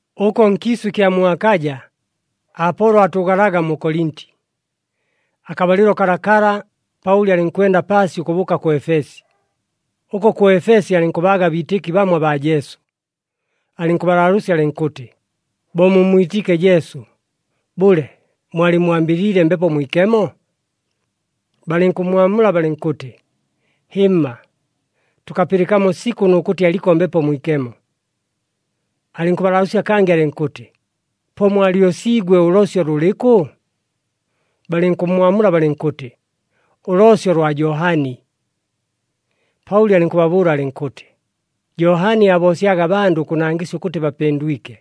Ʉko nkiisʉ ɨkya mu Akaja, Apolo aatʉʉgalaga mu Kolinti. Akabalɨlo kalakala, Paʉli alɨnkwenda paasi ʉkʉbʉʉka kʉ Efesi. Ʉko kʉ Efesi alɨnkʉbaaga abiitɨki bamo abaa Jesu. Alɨnkʉbalaalʉʉsya alɨnkʉtɨ, “Bo mummwitiike Jesu, bʉle mwalɨmmwambɨliile Mbepo Mwikemo?” Balɨnkʉmmwamula balɨnkʉtɨ, “Hɨmma, tʉkapɨlɨkamo sikʉ nʉ kʉtɨ aliko Mbepo Mwikemo.” Alɨnkʉbalaalʉʉsya kangɨ alɨnkʉtɨ, “Po mwalyosiigwe ʉloosyo lʉlɨkʉ?” Balɨnkʉmmwamula balɨnkʉtɨ, “Ʉloosyo lwa Johani.” Paʉli alɨnkʉbabʉʉla alɨnkʉtɨ, “Johani aaboosyaga abandʉ ʉkʉnangɨsya ʉkʉtɨ bapɨndwike.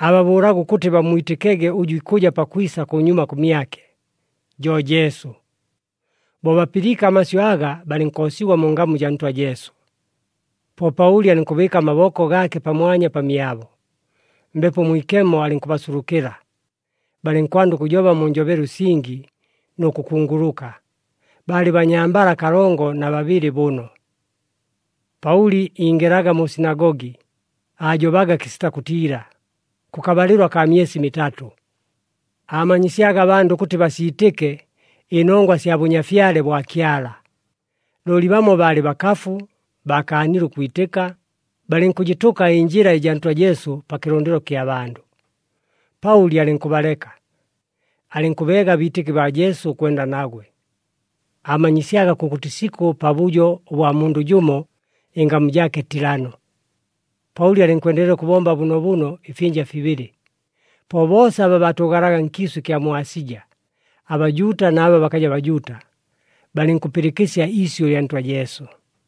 Aababʉʉlaga ʉkʉtɨ bammwitɨkege ʉjʉ ikʉja pakwisa kʉnyuma kʉmyake, jo Jesu.” Bo bapɨliike amasyʉ aga, balɨnkoosigwa mu ngamu jaa Ntwa Jesu. Po Paʉli alɨnkʉbɨɨka amaboko gaake pamwanya pamyabo, Mbepo Mwikemo alɨnkʉbasulukɨla, balɨnkwanda ʉkʉjoba mu njobelo ɨsingi, nʉ kʉkunguluka. Baalɨ banyambala kalongo na babɨlɨ bʉno. Paʉli ingɨlaga mu sinagogi, aajobaga kɨsita kʉtiila, kʉkabalɨlo akaa myesi mitatʉ, aamanyisyaga abandʉ ʉkʉtɨ basiitɨke ɨnongwa sya Bʉnyafyale bwa Kyala. Looli bamo baalɨ bakafu, baakaanile ʉkwitɨka, balɨnkʉjɨtʉka ɨNjɨla ɨjaa Ntwa Jesu pa kɨlʉndɨlo kya bandʉ. Paʉli alɨnkʉbaleka, alɨnkʉbeega abiitɨki baa Jesu ʉkwenda nagwe. Aamanyisyaga kʉkʉtɨ isikʉ pabʉjo ʉbwa mundʉ jʉmo, ɨngamu jaake Tilano. Paʉli alɨnkwendelela ʉkʉbomba bʉnoobʉno ɨfyɨnja fibɨlɨ, po boosa aba baatʉʉgalaga nkiisʉ ɨkya mu Asija, aBajuuta na aba bakaja Bajuuta, balɨnkʉpɨlɨkɨsya iisyʉ lya Ntwa Jesu.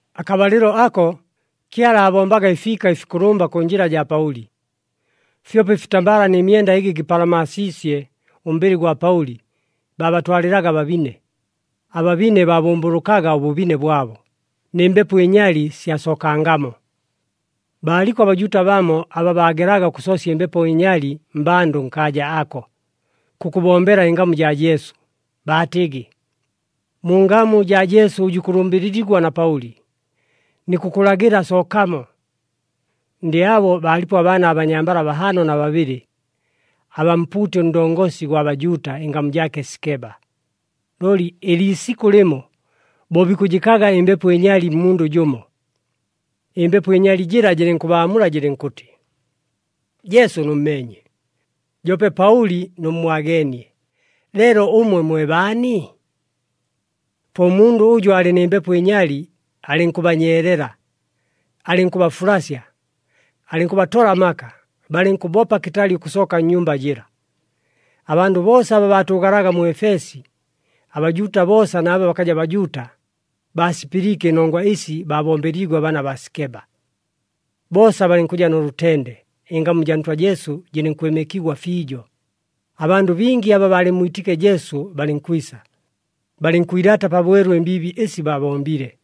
Akabalɨlo ako Kyala aabombaga ɨfiika ɨfikʉlʉmba kʉ njɨla jaa Paʉli. Fyope ɨfitambala nɨ myenda ɨgɨ gɨpalamaasiisye ʉmbɨlɨ gwa Paʉli, baabatwalɨlaga ababine. Ababine baabʉmbʉlʉkaga ʉbʉbine bwabo, nɨ mbepo ɨnyali syasookangamo. Baaliko aBajuuta bamo aba baagelaga ʉkʉsoosya ɨmbepo ɨnyali mmbandʉ nkaaja ako, kʉkʉbombela ɨngamu jaa Jesu, baatɨgɨ, “Mu ngamu jaa Jesu ʉjʉ ikʉlʉmbɨlɨligwa na Paʉli, nikʉkʉlagɨla sookamo!” Ndɨ abo baalipo abaana abanyambala bahaano na babɨlɨ, abaa mpuuti ʉndongosi gwa Bajuuta, ɨngamu jaake Sikeba. Looli ɨliisikʉ lɨmo bo bikʉjɨkaga ɨmbepo ɨnyali mmundʉ jʉmo, ɨmbepo ɨnyali jɨla jɨlɨnkʉbaamula jɨlɨnkʉtɨ, “Jesu nʉmmeenye, joope Paʉli nʉmmwageenie, leelo ʉmwe mwe baani?” Po ʉmundʉ ʉjʉ aalɨ nɨ mbepo ɨnyali, alɨnkʉbanyeelela, alɨnkʉbafulasya, alɨnkʉbatola amaka, balɨnkʉbopa kɨtali ʉkʉsooka nnyumba jɨla. Abandʉ boosa aba baatʉʉgalaga mu Efesi, aBajuuta boosa na aba bakaja Bajuuta, baasipɨliike ɨnongwa ɨsi baabombeliigwe abaana baa Sikeba. Boosa balɨnkʉja nʉ lʉtende, ɨngamu jaa Ntwa Jesu jɨlɨnkwɨmɨkigwa fiijo. Abandʉ bingi aba baalɨmmwitiike Jesu balɨnkwisa, balɨnkwilaata pabwelu ɨmbiibi ɨsi babombile.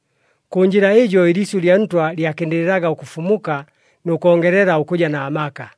Kʉ njɨla ɨjo ɨliisyʉ lya Ntwa lyakɨndɨlɨlaga ʉkʉfumuka nʉ kongelela ʉkʉja na maka.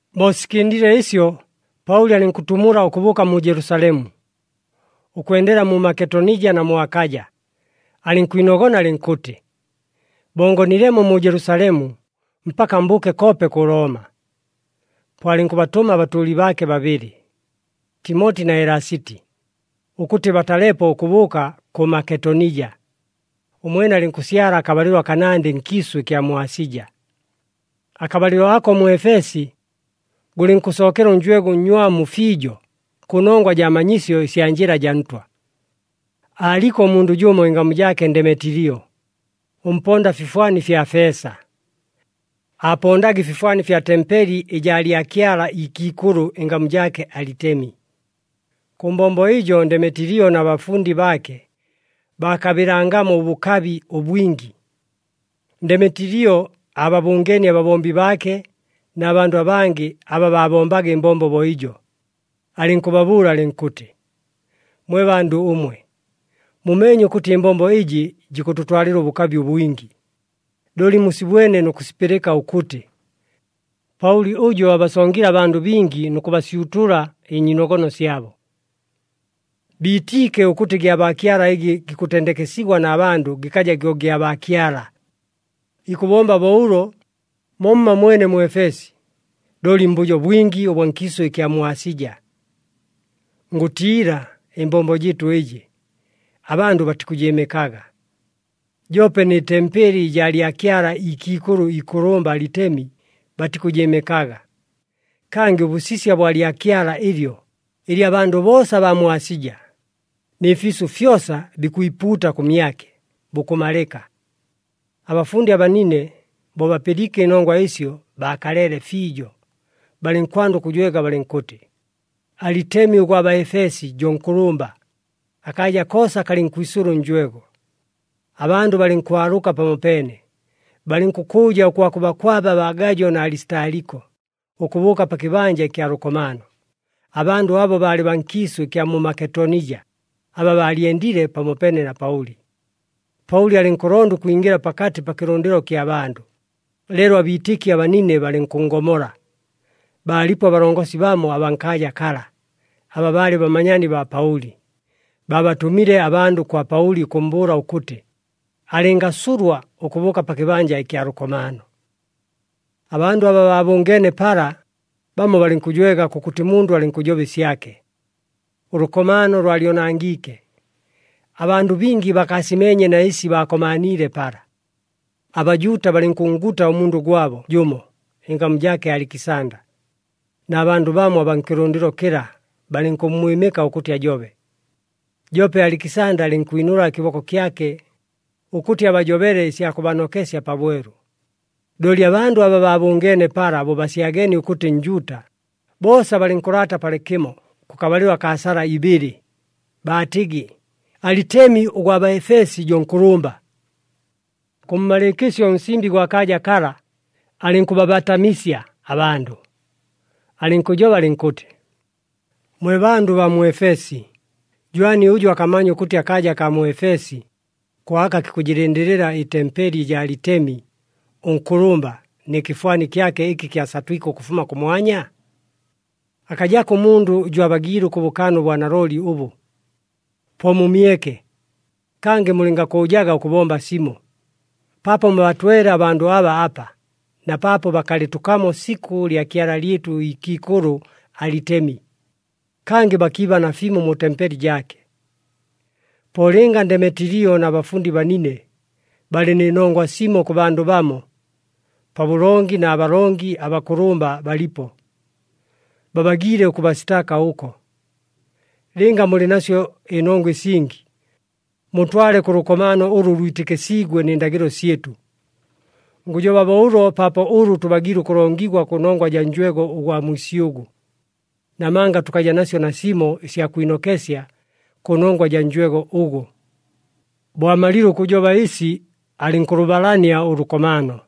Bo sikɨndile ɨsyo, Paʉli alɨnkʉtumula ʉkʉbʉʉka mu Jelusalemu, ʉkwendela mu Maketonija na mu Akaja, alɨnkwinogona alɨnkʉtɨ, “Bo ngonilemo mu Jelusalemu, mpaka mbʉʉke koope kʉ Looma.” Po alɨnkʉbatʉma abatʉʉli baake babɨlɨ, Timoti na Elasiti, ʉkʉtɨ batalepo ʉkʉbʉʉka kʉ Maketonija. Ʉmwene alɨnkʉsyala akabalɨlo akanandɨ nkiisʉ ɨkya mu Asija. Akabalɨlo ako mu Efesi, gʉlɨnkʉsookela ʉnjwego ʉnnywamu fiijo kʉnongwa jaa manyisyo ɨsya Njɨla jaa Ntwa. Aaliko ʉmundʉ jʉmo ɨngamu jaake Ndemetilio, ʉmponda fifwani fya feesa. Aapondaga ɨfifwani fya tempeli ɨjaa lyakyala ikiikʉlʉ, ɨngamu jaake Alitemi. Kʉ mbombo ɨjo Ndemetilio na bafundi baake baakabɨlangamo ʉbʉkabi ʉbwingi. Ndemetilio aababʉngeenie ababombi baake na bandʉ abangɨ aba baabombaga ɨmbombo bo ɨjo, alɨnkʉbabʉʉla alɨnkʉtɨ, “Mwe bandʉ ʉmwe, mumeenye ʉkʉtɨ ɨmbombo ɨjɨ jikʉtʉtwalɨla ʉbʉkabi ʉbwingi. Looli musibwene nʉ kʉsipɨlɨka ʉkʉtɨ, Paʉli ʉjo abasongile abandʉ abingi nʉ kʉbasyutula ɨnyiinogono syabo. Biitiike ʉkʉtɨ gyabaakyala ɨgɨ gikʉtendekesigwa na bandʉ gɨkaja gyo gyabaakyala. Ikʉbomba bo ʉlo momma mwene mu Efesi, looli mbʉjo bwingi ʉbwa nkiisʉ ɨkya mu Asija. Ngʉtiila ɨmbombo jɨɨtʉ ɨjɨ, abandʉ batikʉjɨɨmɨkaga, joope nɨ tempeli ɨjaa lyakyala ikiikʉlʉ ikʉlʉmba Alitemi, batikʉjɨɨmɨkaga. Kangɨ ʉbʉsisya bwa lyakyala ɨlyo, ɨlɨ abandʉ boosa abaa mu Asija nɨ fiisʉ fyosa bikwipuuta kʉmyake, bukʉmalɨka.” Abafundi abanine bo bapɨliike ɨnongwa ɨsyo, baakaleele fiijo, balɨnkwanda ʉkʉjwega balɨnkʉtɨ, “Alitemi ʉgwa Baefesi jo nkʉlʉmba!” Akaaja koosa kalɨnkwisʉla ʉnjwego. Abandʉ balɨnkwalʉka pamopeene, balɨnkʉkʉʉja ʉkwakʉbakwaba baa Gajo na Alisitaliko, ʉkʉbʉʉka pa kɨbanja ɨkya lʉkomaano. Abandʉ abo baalɨ baa nkiisʉ ɨkya mu Maketonija, aba baalyendile pamopeene na Paʉli. Paʉli alɨnkʉlonda ʉkwingɨla pakatɨ pa kɨlʉndɨlo kya bandʉ, leelo abiitɨki abanine balɨnkʉnngomola. Baalipo abalongosi bamo abaa nkaaja kala, aba baalɨ bamanyaani baa Paʉli. Baabatʉmile abandʉ kwa Paʉli ʉkʉmmbʉʉla ʉkʉtɨ, alɨngasulwa ʉkʉbʉʉka pa kɨbanja ɨkya lʉkomaano. Abandʉ aba baabʉngeene pala, bamo balɨnkʉjwega, kʉkʉtɨ mundʉ alɨnkʉjoba ɨsyake. Ʉlʉkomaano lwalyonangiike. Abandʉ bingi bakaasimeenye na ɨsi baakomaaniile pala. ABajuuta balɨnkʉnnguta ʉmundʉ gwabo jʉmo, ɨngamu jaake Alikisanda, na bandʉ bamo abaa nkɨlʉndɨlo kɨla balɨnkʉmmwɨmɨka ʉkʉtɨ ajobe. Joope Alikisanda alɨnkwinʉla ɨkɨboko kyake, ʉkʉtɨ abajobele ɨsya kʉbanokesya pabwelu. Looli abandʉ aba baabʉngeene pala bo basyageenie ʉkʉtɨ Njuuta, boosa balɨnkʉlaata palɨkɨmo kʉkabalɨlo akaa sala ibɨlɨ, baatɨgɨ, “Alitemi ʉgwa Baefesi jo nkʉlʉmba!” Kʉmmalɨɨkɨsyo ʉnsimbi gwa kaaja kala alɨnkʉbabatamisya abandʉ, alɨnkʉjoba alɨnkʉtɨ, “Mwe bandʉ baa mu Efesi, jwani ʉjʉ akamanya ʉkʉtɨ akaaja akaa mu Efesi, ko aka kikʉjɨlɨndɨlɨla ɨtempeli ɨjaa Alitemi ʉnkʉlʉmba, nɨ kɨfwani kyake ɨkɨ kyasatwike ʉkʉfuma kʉmwanya? Akajako ʉmundʉ ʉjʉ abagiile ʉkʉbʉkaana ʉbwanalooli ʉbʉ. Po mumyeke, kangɨ mulɨngakʉʉjaga ʉkʉbomba simo, paapo mubatwele abandʉ aba apa, na paapo bakalɨtʉkamo sikʉ lyakyala lyɨtʉ ikiikʉlʉ Alitemi, kangɨ bakiiba nafimo mu tempeli jaake. Po lɨnga Ndemetilio na bafundi banine, balɨ nɨ nongwa simo kʉ bandʉ bamo, pabʉlongi na balongi abakʉlʉmba balipo. Babagiile ʉkʉbasitaaka ʉko. Lɨnga mulɨ nasyo ɨnongwa ɨsingi, mutwale kʉ lʉkomaano ʉlʉ lwitɨkɨsiigwe nɨ ndagɨlo syɨtʉ. Ngʉjoba bo ʉlo paapo ʉlʉ tʉbagiile ʉkʉlongigwa kʉnongwa jaa njwego ʉgwa mwisyʉgʉ, namanga tʉkaja nasyo nasimo ɨsya kwinokesya kʉnongwa jaa njwego ʉgʉ.” Bo amalile ʉkʉjoba ɨsi, alɨnkʉlʉbalania ʉlʉkomaano.